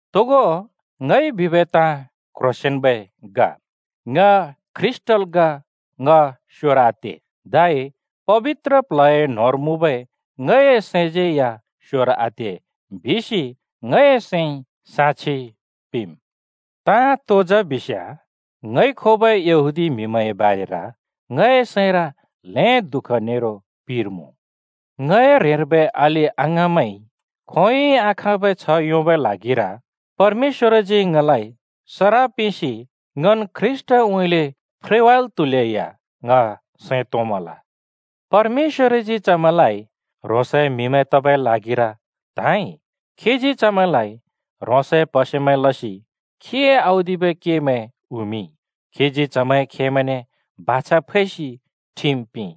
तोगो ङइ बिबै ताँ क्ह्रोंसेंन्बै ग। ङ ख्रीष्‍टल् ग, ङ स्‍योर आते। धै पबित्र प्ल्हए न्होंर मुँबै ङए सैंज्‍यै या स्‍योर आते बिसि ङए सैंइ साक्षि पिंम्। ताँ तो जा बिस्‍याँ, ङइ खोबै यहूदी म्हिमैंए बारेर ङए सैंर ल्हें दुःख नेरो पिर मुँ। ङए ह्रेंर्बै अलि अङाँमैंइ खोंयोंइ आखाँबै छ्ह योंबै ल्हागिर परमेश्‍वरजी ङलाइ सराप पिंसि ङन् ख्रीष्‍टउँइँले फ्रेवाल् त्‍हुलेया ङ सैं तोंमल। परमेश्‍वरजी चमैंलाइ ह्रोंसए म्‍हिमैं तबै ल्हागिर त्‍हाँइ। खीजी चमैंलाइ ह्रोंसए प्‍हसेमैं लसि खीए औदिबै केमैं उँइँमिंइ। खीजी चमैंए खेमैंने बाछा फैसि ठिम पिंइ,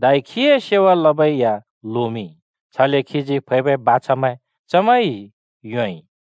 धै खीए सेवा लबै या लोमिंइ, छले खीजी फैबै बाछामैं चमैंइ योंइ।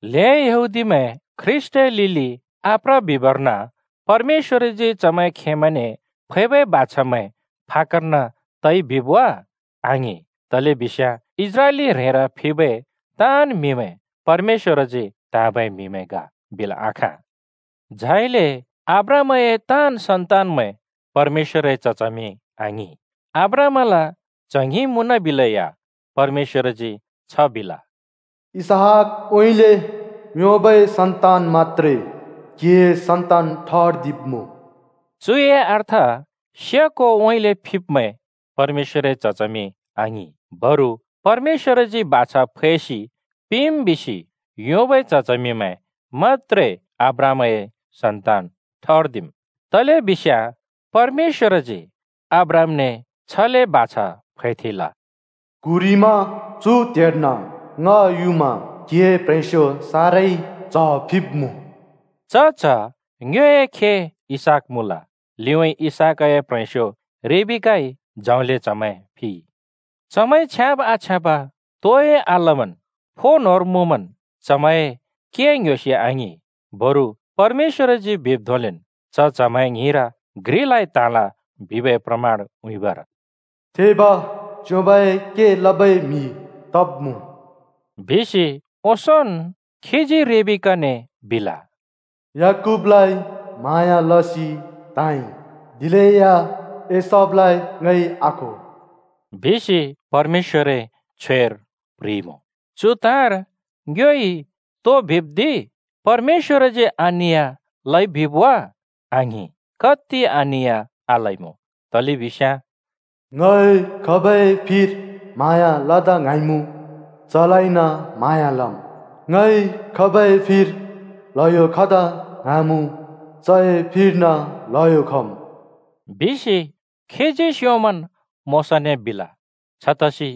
ल्हें यहूदीमैं ख्रीष्‍टए लिलि आप्र बिबर्न परमेश्‍वरजी चमैंए खेमैंने फैबै बाछामैं फाक्‍कर्न तइ बिब् वा? आङिं, तलेबिस्याँ इस्राएली ह्रेंर फिबै ताँन् म्‍हिमैं परमेश्‍वरजी त्‍हाँबै म्‍हिमैं ग बिल् आखाँ। झाइले अब्राहामए ताँन् सन्तानमैं परमेश्‍वरए च्ह-च्हमिमैं आङिं। अब्राहामल च्‍ह ङ्हिं मुँनबिलेया परमेश्‍वरजी छ बिल, “इसहाकउँइँले योंबै सन्‍तान मत्‍त्रे क्‍हिए सन्‍तान ठर्दिब्‍मुँ।” चुए अर्थ, से कोउँइँले फिब्मैं परमेश्‍वरए च्ह-च्हमिमैं आङिं। बरु परमेश्‍वरजी बाछा फैसि पिंम् बिसि योंबै च्ह-च्हमिमैं मत्‍त्रे अब्राहामए सन्‍तान ठर्दिम्। तलेबिस्याँ परमेश्‍वरजी अब्राहामने छले बाछा फैथेंल, “क्‍हुरिमा चु त्हेर्न ङ युमा क्‍हिए प्‍ह्रेंस्‍यो साराई च्‍ह फिब्‍मुँ।” च च्ह ङ्योए खे इसहाक मुँल, लिउँइँ इसहाकए प्‍ह्रेंस्‍यो रिबेकाइ जौंले च्‍हमैं फिइ। चमैंइ छ्याँब आछ्याँब तोइ आलमन् फो न्होंर मुँमन् चमैंए के ङ्‌ह्‍योसि आङिं, बरु परमेश्‍वरजी बिब् धोंलेन्, च च्हमैं ङ्हिंर घ्रिलाइ त्हाँल बिबै प्रमाण उँइँबर “थेब च्‍योंबए के लबै म्हि तब्‍मुँ,” बिसि ओंसोंन् खीजी रिबेकाने बिल। “याकूबलाइ म्हाँया लसि त्‍हाँइ, दिलेया एसावलाइ ङइ आखो बिसि,” परमेश्‍वरए छ्वेर प्ह्रिइमुँ। चु ताँर ङ्योइ तो बिब् दि? परमेश्‍वरजी अनिया लइ बिब् वा? आङिं, कत्ति अनिया आलइमुँ! तलेबिस्याँ “ङइ खाब‍ए फिर म्हाँया लदा ङ्हाँमुँ, चलाइन म्हाँया लम्। ङइ खाबै फिर ल्हयो खदा ङ्हाँमुँ, चए फिर्न ल्हयो खम्।” बिसि खीजी स्‍योंमन् मोशाने बिल। छतसि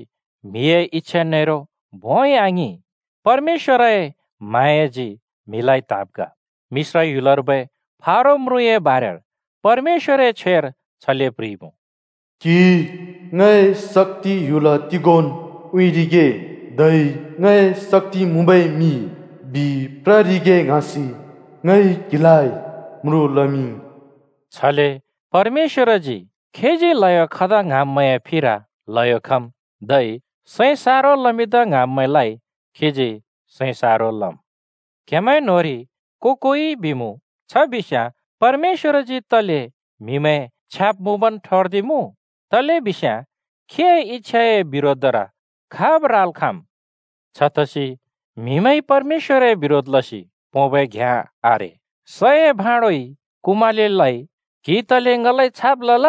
म्‍हिए इच्छा नेरो भोंइ आङिं, परमेश्‍वरए म्हाँयाजी म्हिलाइ त्‍हाँब् ग। मिश्र ह्‍युलर्बै फारो म्रुँए बारेर परमेश्‍वरए छ्वेर छले प्ह्रिइमुँ, “क्हिइ ङए शक्‍ति ह्‍युल तिगोंन् उँइँरिगे, धै ङए शक्‍ति मुँबै मिं बिप्ररिगे ङ्हाँसि, ङइ क्हिलाइ म्रुँ लमिंइ।” छले परमेश्‍वरजी खीजी ल्हयो खदा ङ्हाँब्‍मैंए फिर ल्हयो खम्, धै सैं सारो लमिंदा ङ्हाँब्‍मैंलाइ खीजी सैं सारो लम्। क्‍हेमैं न्‍होंरि को-कोइइ बिमुँ, “छ बिस्‍याँ परमेश्‍वरजी तले म्‍हिमैं छ्याब् मुँबन् ठर्दिमुँ? तलेबिस्याँ खीए इच्छाए बिरोधर खाब् राल् खाँम्?” छतसि म्‍हिमैंइ परमेश्‍वरए बिरोध लसि पोंबै घ्याँ आरे। सए भाँडोइ कुमालेलाइ “क्हिइ तले ङलाइ छाब् लल?”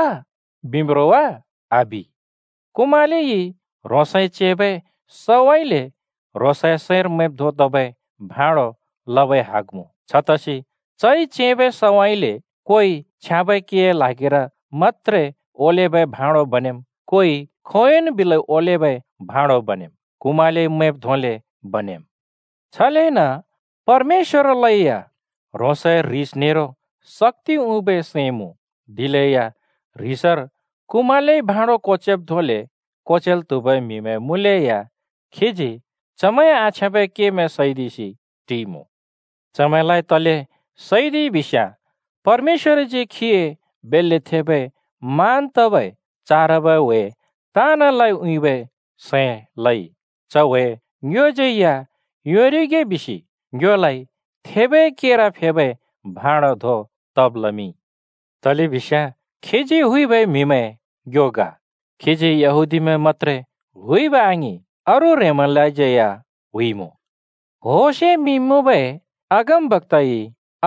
बिम्‌ रो वा? आबि! कुमालेइ ह्रोंसइ चेंबै सउँइँले ह्रोंसए सैंर मैंब् धों तबै भाँडो लबै हग मुँ। छतसि चइ चेंबै सउँइँले कोइ छ्याँबै केए ल्हागिर मत्‍त्रे ओलेबै भाँडो बनेम्, कोइ खोंयोंन् बिलै ओलेबै भाँडो बनेम्। कुमालेइ मैंब् धोंले बनेम्। छलेन परमेश्‍वरलै या ह्रोंसए ह्रिस नेरो शक्‍ति उँइँबै सैं मुँ। दिलेया ह्रिसर कुमालेइ भाँड कोचेब् धोंले कोचेल् त्हुबै म्‍हिमैं मुँलेया खीजी चमैंए आछ्याँबै केमैं सैदिसि टिइमुँ। चमैंलाइ तले सैदिइ बिस्‍याँ परमेश्‍वरजी खीए बेल्‍ले थेबै मान तबै चारबै ह्‍वे ताँनलाइ उँइँबै सैं लइ। च ह्‍वे ङ्योज्‍यै या योंरिगे बिसि ङ्योलाइ थेबै केर फेबै भाँडो धों तब् लमिंइ, तलेबिस्याँ खीजी हुइबै म्‍हिमैं ङ्यो ग। खीजी यहूदीमैं मत्‍त्रे हुइब आङिं, अरू ह्रेंमैंलाज्यै या हुइमुँ। होशे मिं मुँबै अगमबक्‍ताइ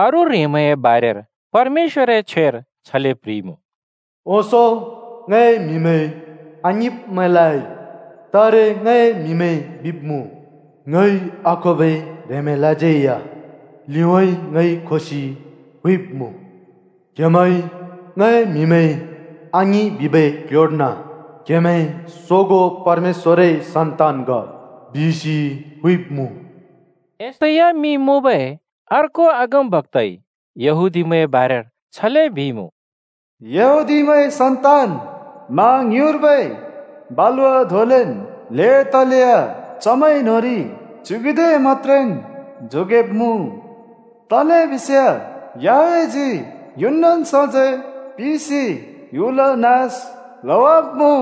अरू ह्रेंमैंए बारेर परमेश्‍वरए छ्वेर छले प्ह्रिइमुँ, “ओंसों ङए म्‍हिमैं आङिंब्मैंलाइ तारे ङए म्‍हिमैं बिब्‍मुँ। ङइ आखोबै ह्रेंमैंलाज्यै लिउँइँ ङइ खोसि हुइब्‍मुँ। क्‍हेमैं ङए म्‍हिमैं आङिं बिबै क्ल्ह्‍योर्न ‘क्‍हेमैं सोगों परमेश्‍वरए सन्‍तान ग’ बिसि हुइब्‍मुँ।” यशैया मिं मुँबै अर्को अगमबक्‍ताइ यहूदीमैंए बारेर छले बिइमुँ, “यहूदीमैंए सन्तान मा ङ्युँइर्बै बालुवा धोंलेन् ल्हें तलेया चमैं न्‍होंरि च्‍युगुदे मत्‍त्रेन् जोगेब्‍मुँ। तलेबिस्याँ याहवेहजी युनन् सजैं पिंसि ह्‍युल नास लवाब्‍मुँ।”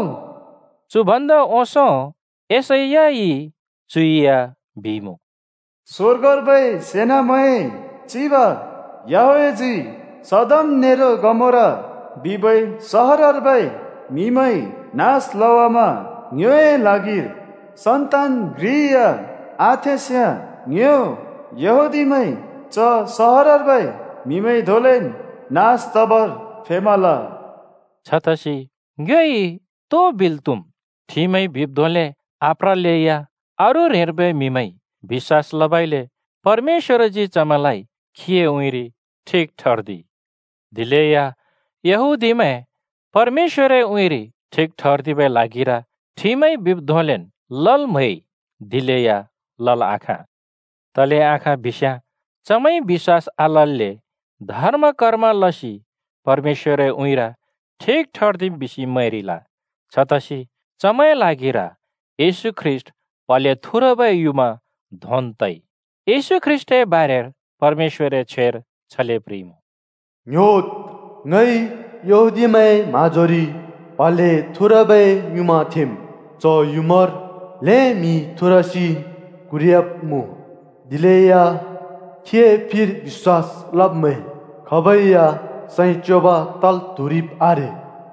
चु भन्दा ओंसों यशैयाइ चु या बिइमुँ, “स्वर्गर्बै सेनामैंए चिब याहवेहजी सदोम नेरो गमोरा बिबै सहरर्बै म्‍हिमैं नास लवामा ङ्योए ल्हागिर सन्‍तान घ्रि या आथेंस्‍याँ ङ्यो यहूदीमैं च सहरर्बै म्‍हि धोंलेन् नास तबर फेमल।” छतसि ङ्योइ तो बिल् त्‍हुम्? ठिमइ बिब् धोंले आप्रलैया अरू ह्रेंर्बै म्‍हिमैंइ बिश्‍वास लबइले परमेश्‍वरजी चमैंलाइ खीए उँइँरि ठिक ठर्दिइ। दिलेया यहूदीमैं परमेश्‍वरए उँइँरि ठिक ठर्दिबै ल्हागिर ठिमइ बिब् धोंलेन् लल् म्हैइ दिलेया लल् आखाँ। तले आखाँ बिस्‍याँ चमैंइ बिश्‍वास आलल्‍ले धर्म‍-कर्म लसि परमेश्‍वरए उँइँर ठिक ठर्दिम् बिसि मैंरिल। छतसि चमैंए ल्हागिर येशू ख्रीष्‍ट प्हले थुरबै युँमा धोंन् तइ। येशू ख्रीष्‍टए बारेर परमेश्‍वरए छ्वेर छले प्ह्रिइमुँ, “ङ्‌ह्‍योद्, ङइ यहूदीमैंए म्‍हाँजोरि प्हले थुरबै युँमा थेंम्, च युँमार ल्हें म्‍हि थुरसि क्‍हुरयाब्‍मुँ, दिलेया खीए फिर बिश्‍वास लब्मैं खाबै या सैं च्योंब तल् त्हुरिब् आरे।”